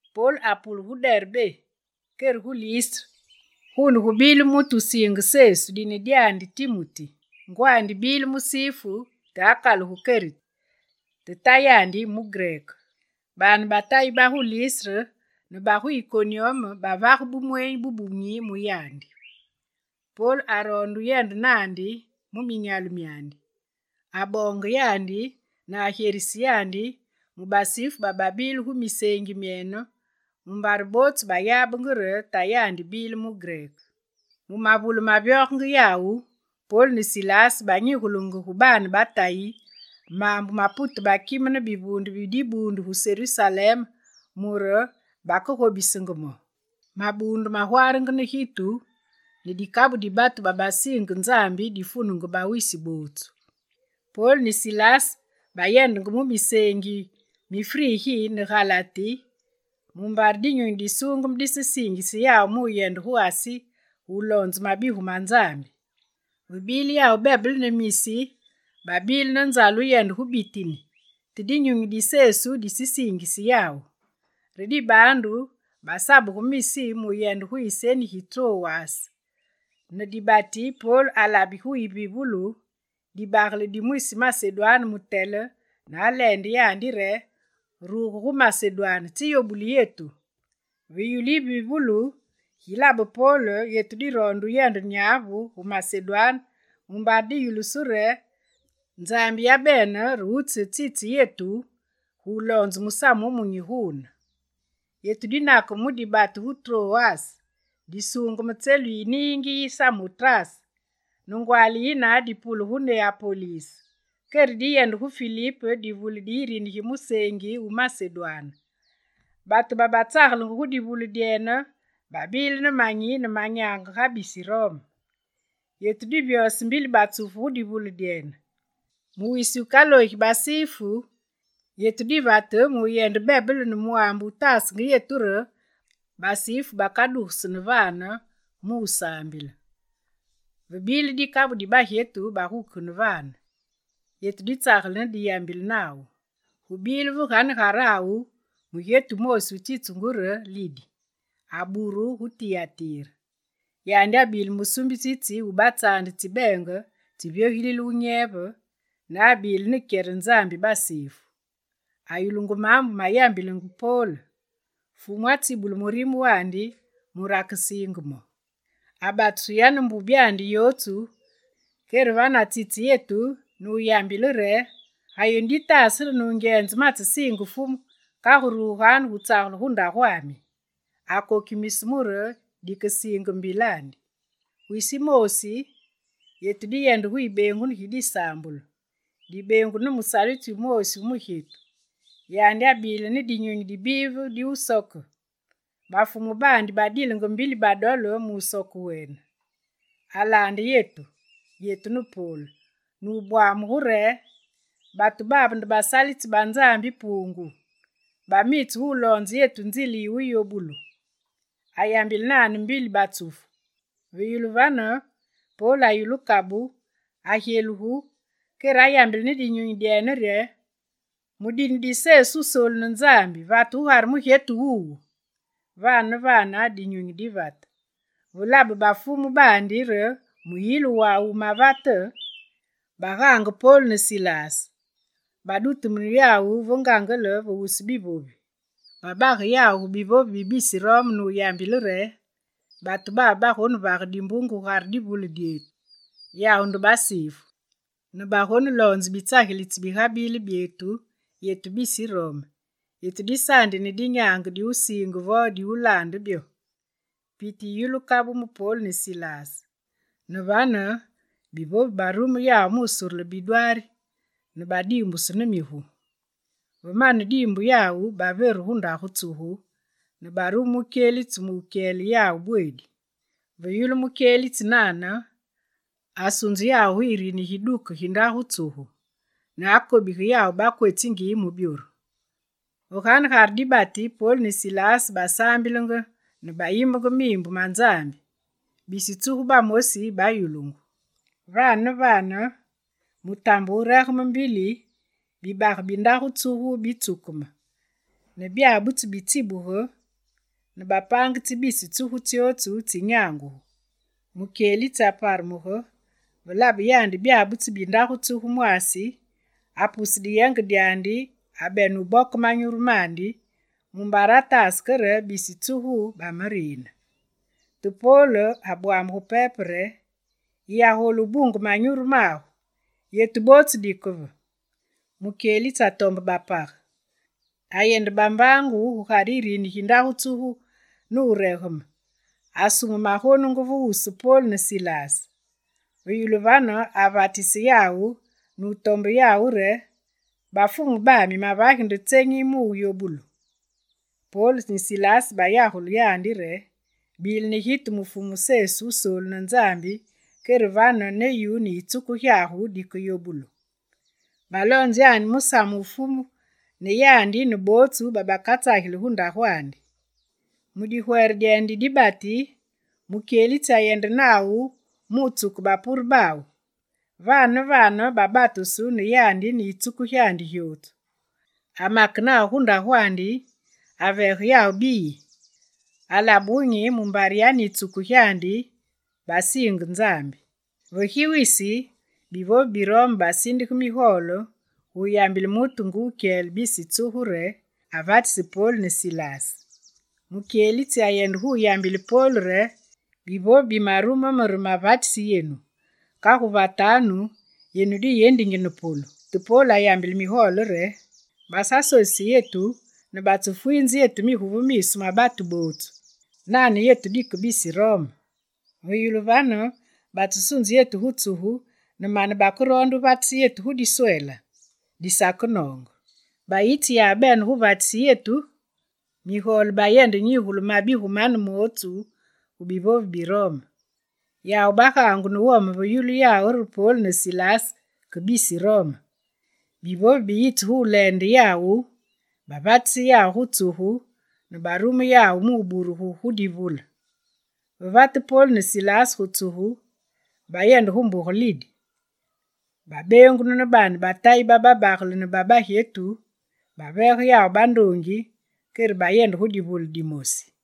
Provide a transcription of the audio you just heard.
Pol apule gu Derbé, kere gu Listre. Guune gubile mutu wusiinge Sesu, dine dyandi Timuti; ngwandi bile musifu te akalugu kereti, te tayandi mugreke. Baane ba Tayi ba gu Listre ne ba gu Ikonyume bavage bumweenyi bubunyi mu yandi. Pol aroonde wuyende naandi mu minyalu myandi. Aboonge yandi, ne agyerise yandi, mu basifu bababile gu miseengi myene, mumbare bootsu bayabenge re tayandi bile mugreke. Mu mavule mavyogenge yawu, Pol ne Silas banyigulenge gu baane ba Tayi maambu mapute bakime ne bivuunde bi dibuundu gu Serusalem mure bakegobisenge mo. Mabuundu magwaarenge ne gitu ne dikabu di batu babasiinge Nzambi difunenge bawisi bootsu. Pol ne Silas bayende gu miseengi mi Frigi ne Galati mumbare Dinyunyi Disuungeme disesiingise yawu mu wuyende gu Asi gu wuloonze mabigu ma Nzambi. Ve bile yawu bebele ne Misi, babile ne nzale wuyende gu Bitini, te Dinyunyi di Sesu disesiingise yawu. Re dibaandu basabuge Misi mu wuyende gu yiseni gi Trowas. Ne dibati, Pol alabe gu yivivulu, dibagele di mwisi Masedwane mutele, ne aleende yandi re: «Ruge gu Masedwane, tsiyobuli yetu!» Ve yulu yivivulu gilabe Pol, yetu diroonde wuyende nyavu gu Masedwane mumbare diyulusu re Nzambi yabene re wutsitse yetu guloonze Musamu Wumunyi guune. Yetu dinakeme mu dibatu gu Trowas, disuungeme tselu yi niingi yi Samotrase. Ne ngwaali yine dipule gu Neapolise. Kere diyende gu Filip, divule di yirini gi museengi wu Masedwane. Batu babatsagelenge gu divule dyene babilenge ne manyi ne manyaange ga bisi Rome. Yetu divyose mbili batsufu gu divule dyene. Mu wisi wukaloogi basifu, yetu divate mu wuyende bebele ne mwaambe wutaasenge yetu re basifu bakadugeseni vane mu wusaambile. Vebile dikabu di bagyetu bagukegene vane. Yetu ditsagele ne diyambile nawu. Gubile ve ganegarawu mugyetu wumoosi wutsitsungu re Lidi, aburu gu Tiyatire. Yandi abile musuumbisitsi wu batsaande tsi beenge tsi vyogilile wunyeve, ne abile ne kyere Nzambi basifu. Ayulungu maambu mayambilenge Pol. Fumu atsibule murime wandi mure akesiinge mo. Abatusu yane mbubyandi yootsu, kere vane atsitse yetu, ne wuyambile re: «Ga yenu ditaase re nungyenze matsesiinge Fumu, kagu ruganu gutsagele gu ndagwami!» Akokimise mure dikesiinge mbilandi. Wisi wumoosi, yetu diyende gu yibeengunu gi disaambulu. Dibeengunu ne musalitsi wumoosi wu mugyetu. Yandi abile ne dinyunyi di bive di wusoke. Bafumu baandi badilenge mbili badole musoke wene. Alaande yetu, yetu ne Pol, nubwamuge re: «Batu babe nde basalitsi ba Nzambi Puungu! Bamitse guloonze yenu nzile yi wuyobulu.» Ayambile nane mbili batsufu. Ve yulu vane, Pol ayulu kabu, agyelugu kere ayambile ne dinyunyi re: «Mu dine di Sesu Wusoolu ne Nzambi, vate gugare mugyetu wuwu!» Vane ne vane, dinyunyi divate. Ve labe bafumu baandi re muyiilu wawu wumavate, bagaange Pol ne Silas. Badutumune yawu ve ngangele ve wusu bivovi. Babage yawu gu bivovi bi bisi Rome nuyambile re: «Batu babe bagonevage dimbunge gugare divule dyetu. Yawu nde basifu ne bagoneloonze bitsagilitsi bigabile byetu, yetu bisi Rome, yetu disaandi ne dinyaange di wusiinge vo di wulaande byo.» Piti yiyulu kabu mu Pol ne Silas. Ne vane, bivovi barume yawu musurule bidwaari ne badiimbusu ne migu. Ve mane diimbu yawu, baveru gu ndagu tsugu ne barume mukyelitsi mukyele yawu bweedi. Ve yulu mukyelitsi nane, asunze yawu gu yirini gi duke gi ndagu tsugu ne akobige yawu bakwetsingi mu byoru. Ve ganegare dibati, Pol ne Silas basaambilenge ne bayimbenge miimbu ma Nzambi. Bisi tsugu bamosi bayulungu. Vane ne vane, mutambe wuregeme mbili, bibage bi ndagu tsugu bitsukeme ne byabutsu bitsibuge ne bapaange tsi bisi tsugu tsyootsu tsinyangugu. Mukyelitsi aparumuge, ve labe yandi byabutsu bi ndagu tsugu mwaasi, apuse diyenge dyandi ne abene wuboke manyuru mandi, mumbare ataase ke re bisi tsugu bamariine. Te Pol abwamugu pepe re: «Yiyagolu wubunge manyuru magu! Yetu bootsu dike ve!» Mukyelitsi atombe bapage. Ayende bambaangu gugare yirini gi ndagu tsugu ne wuregeme, asume magonungu ve wusu Pol ne Silas. Ve yulu vane avatise yawu ne wutombe yawu re: «bafumu bami, mavagi nde tsenyi muyobulu?» Pol ne Silas bayagule yandi re: «Bile ne gitu mu Fumu Sesu Wusoolu ne Nzambi, kere vane, ne yu ne yitsuku gyagu dikeyobulu.» Baloonze yandi musamu wu Fumu, ne yandi ne bootsu babakatsageli gu ndagwandi. Mu digwere dyene di dibati, mukyelitsi ayende nawu mu wutsuke bapure bawu. Vane ne vane babatusu, ne yandi ne yitsuku gyandi gyootsu. Amake nawu gu ndagwandi, aveege yawu biyi. Alabe wunyi mumbare yane yitsuku gyandi basiinge Nzambi. Ve gi wisi, bivovi bi Rome basindige migole gu wuyambile mutu nge wukyele bisi tsugu re «avatisi Pol ne Silas!» Mukyelitsi ayende gu yambile Pol re: «Bivovi bamarume me re mavatisi yenu. Kagu vatanu yenu diyendingi ne polu.» Te Pol ayambile migole re: «Basasosise yetu ne batsefwiinze yetu ne migu ve miisu ma batu bootsu! Nane yetu dike bisi Rome! Ve yulu vane batsesunze yetu gu tsugu, ne mane bakeroonde wuvatise yetu diswela? Disakenoonge! Bayitsi yawu bene guvatise yetu!» Migole bayende nyigule mabigu mane mootsu gu bivovi bi Rome. Yawu bagaangu ne wome ve yulu yawu re Pol ne Silas ke bisi Rome. Bivovi biyitse gu wuleende yawu, bavatise yawu gu tsugu ne barume yawu mu wuburugu gu divule. Ve vate Pol ne Silas gu tsugu, bayende gu mbuge Lidi. Babeengunu ne baane ba Tayi ba babagele ne ba bagyetu, baveege yawu bandoongi, kere bayende gu divule dimosi.